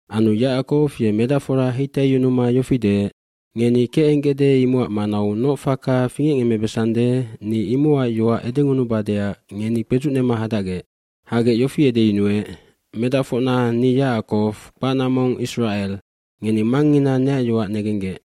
aAnu Yacakow ye medacfora heitaiyunuma yofi deec, “Ngeni kecenggecde imocac manau noc faka fingecngemmebesande ni imocac yoac edengunubadeac ngeni kpedzucnema hadacgec.” Hagec yofi edeyunuec, “Medacfocna ni Yacakow, kpacna mong Isracel. Ngeni mangngina neac yoac negenggec.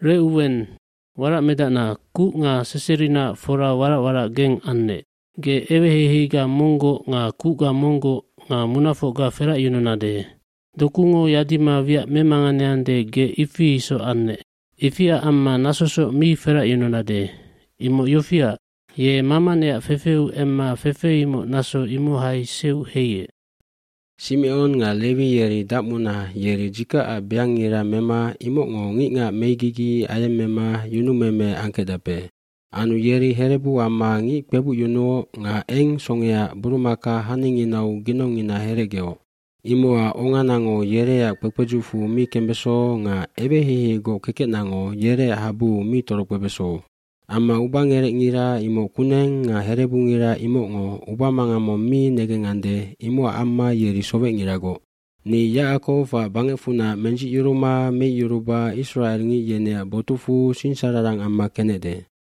bRecuwen, waracmedacna kuc nga seserinaac fora warac warac geng annec. Ge eweheiheiga monggoc nga kucga monggoc nga munafocga feracyununade. cDokungo yadima wiac memanganeande ge ifi isoc annec. Ifiac amma nasosoc mi feracyununade. Imoc yofiac, ye mama neac fefeu emma fefe imoc naso imohai seuc heiec. dSimecon nga Lewi yeri dacmuna yeri dzikacac beangngira mema imocngo ngicngac megigi ayemmema yunumeme angkecdape. eAnu yeri herebu amma ngic kpebucyunuoc nga eng songeaac burumaka haninginau ginongngina herecgeoc. Imocac onganango yereac kpekpedzucfu mi kembeso nga eweheiheigoc kekecnango yereac habuu mi torokpebeso. fAmma ubagerecngira imoc kuneng nga herebungira imocngo ubamangang mong mi negengande imocac amma yeri sowecngiragoc. Ni Yacakowac bangecfunac mendzicyuruma meicyuruba isracelngic yeneac botucfu singsararang amma kenecde.”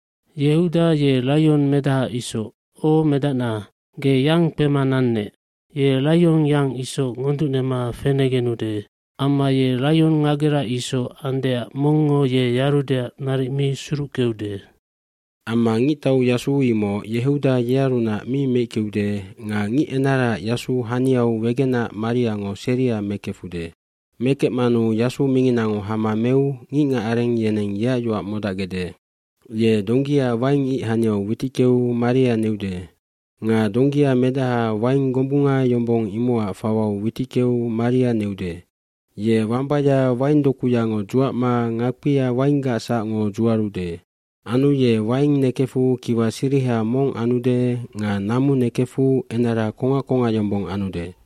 hYehuda ye laionmedaha isoc. O medacna, ge yang kpema nannec. Ye laionyang isoc ngonducnema fenegenude. Amma ye laionngagera isoc andeac mongngo ye yarudeac naric mi suruckeude. iAmma ngictauyasu imoc Yehuda yearunac mi meickeude nga ngicenaraac yasu haniau wegenac mariango seria mekefude. Mekecmanu yasu minginango hama meu ngicngacareng yeneng yeac yoac modacgecde. Ye donggia waing ic haniau witickeu maria neude. Nga donggia medaha waing gombunga yombong imocac fawau witickeu maria neude. Ye wambaya waingdokuyango dzuacma ngakpia wainggac sacngo dzuarude. Anu ye waing nekefu kiwa siriha mong anude nga namu nekefu enara kongac kongac yombong anude.”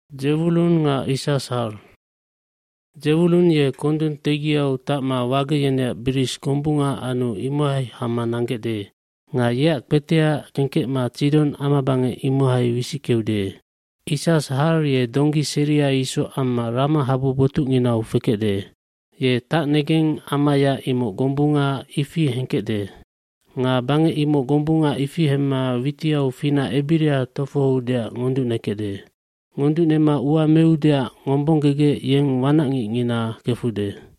j“Dzewulun ye kondung tegiau tacma wage yeneac biris gombunga anu imohai hama nanggecde. Nga yeac kpetea kengkecma Tsidon amabangec imohai wisickeude. kIssashar ye donggi seria isoc amma ramahabu botucnginau fekecde. Ye tacnegengamaya imoc gombunga ifi hengkecde. Nga bangec imoc gombunga ifi hemma witiau finac ebira tofohoudeac ngonducnekecde. Ngonducnema ua meudeac ngombonggegec yeng wanacngicngina kefude.”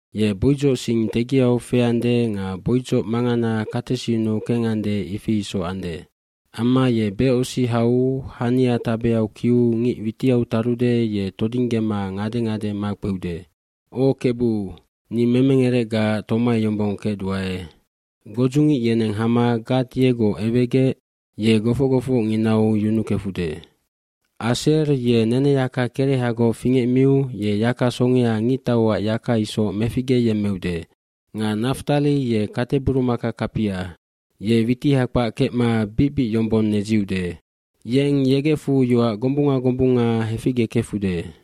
Ye boidzoc sing tegiau feande nga boidzoc mangana katesinnu kengande ifi isoc ande. Amma ye becosi hau hania tabeau kiu ngic witiau tarude ye todinggema ngade ngade makpeude. mO Kebu, ni memengerecgaac tomai yombong kecduae. Godzucngic yeneng hama Gad yegoc ewegec ye gofoc gofocnginau yunukefude. nAser ye neneyaka kerehagoc fingecmiu ye yaka songea ngictauac yaka isoc meficgeyemmeude. oNga Naftali ye kateburumaka kapia. Ye witiha kpac kecma bic bic yombong nedziude. Yeng yegecfu yoac gombunga gombunga heficgekefude.”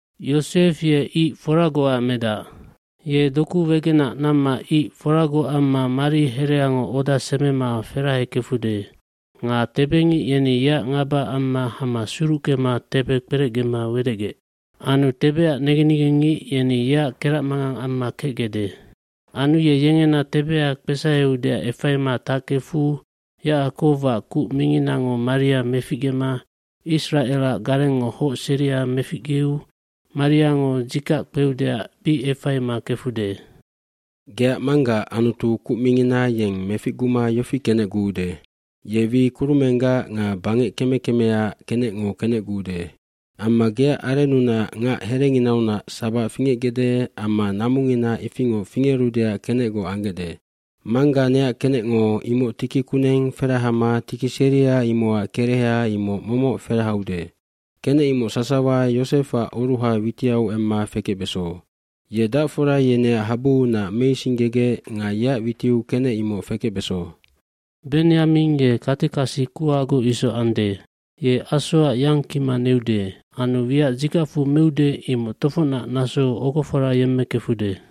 “Yosef ye ic foragocac medac. Ye doku wegenac namma ic foragoc amma mari hereango oda semema ferahekefude. Nga tebengic yeni yeac ngaba amma hama suruckema tebe kperecgema wedecgec. Anu tebeac negen negengngic yeni yeac keracmangang amma kecgecde. Anu ye yengena tebea kpesaheudeac efaima tackefu Yacakowac Kuc Minginango maria meficgema Isracelac Garengngo Hoc seria meficgeu mariango dzikac kpeudeac bic efaima kefude. Geac manggaac Anutu Kuc Mingina yeng meficguma yofi kenecguude. Ye wi kurumenggac nga bangec keme kemeaac kenecngo kenecguude. Amma geac arennunac ngac herenginaunac sabac fingecgecde amma namungina ifingoc fingerudeac kenecgoc anggecde. Mangga neac kenecngo imoc tiki kuneng ferahama tiki seria imocac kereha imoc momoc ferahaude. Kenec imoc sasawa Yosefac oruha witiau emma fekecbeso. Ye dacfora yeneac habuunac meisinggegec nga yeac witiu kenec imoc fekecbeso. pBenyamin ye katekasi kuhagoc isoc ande. Ye asoac yang kima neude. Anu wiac dzikacfu meude imoc tofocnac nasou ogofora yemmekefude.”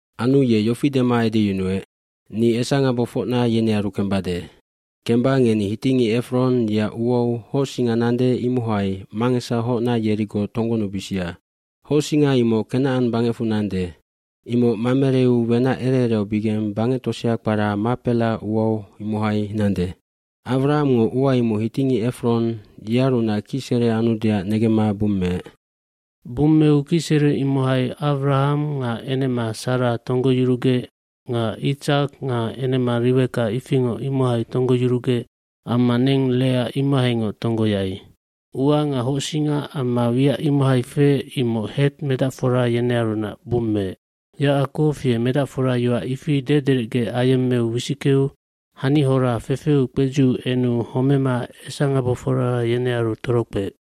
qAnu ye yofi dema edeyunuec, “Ni esangabofocna yenearu kembade. Kemba ngeni hitingic Efron yeac uau hocsinga nande imohai mangesahocna yerigoc tonggonubisia. rHocsinga imoc Kenacan bangecfu nande. Imoc Mamereu wenac ere eraubigeng bangec tosea kpara Mahpela ua imohai nande. Awramngo ua imoc hitingic Efron yearunac kicsere anudeac negemma bummeec. sBummeu kicsere imohai Awraham nga enema Sara tonggoyurugec nga Itsak nga enema Riweka ifingoc imohai tonggoyurugec amma neng Lea imohaingoc tonggoyai. Ua nga hocsinga amma wiac imohai feec imoc Het medacfora yenearunac bummeec.” tYacakow ye medacfora yoac ifi dederecge ayemmeu wisickeu hanihora fefeu kpedziu enu homema esangabofora yenearu torokpeec.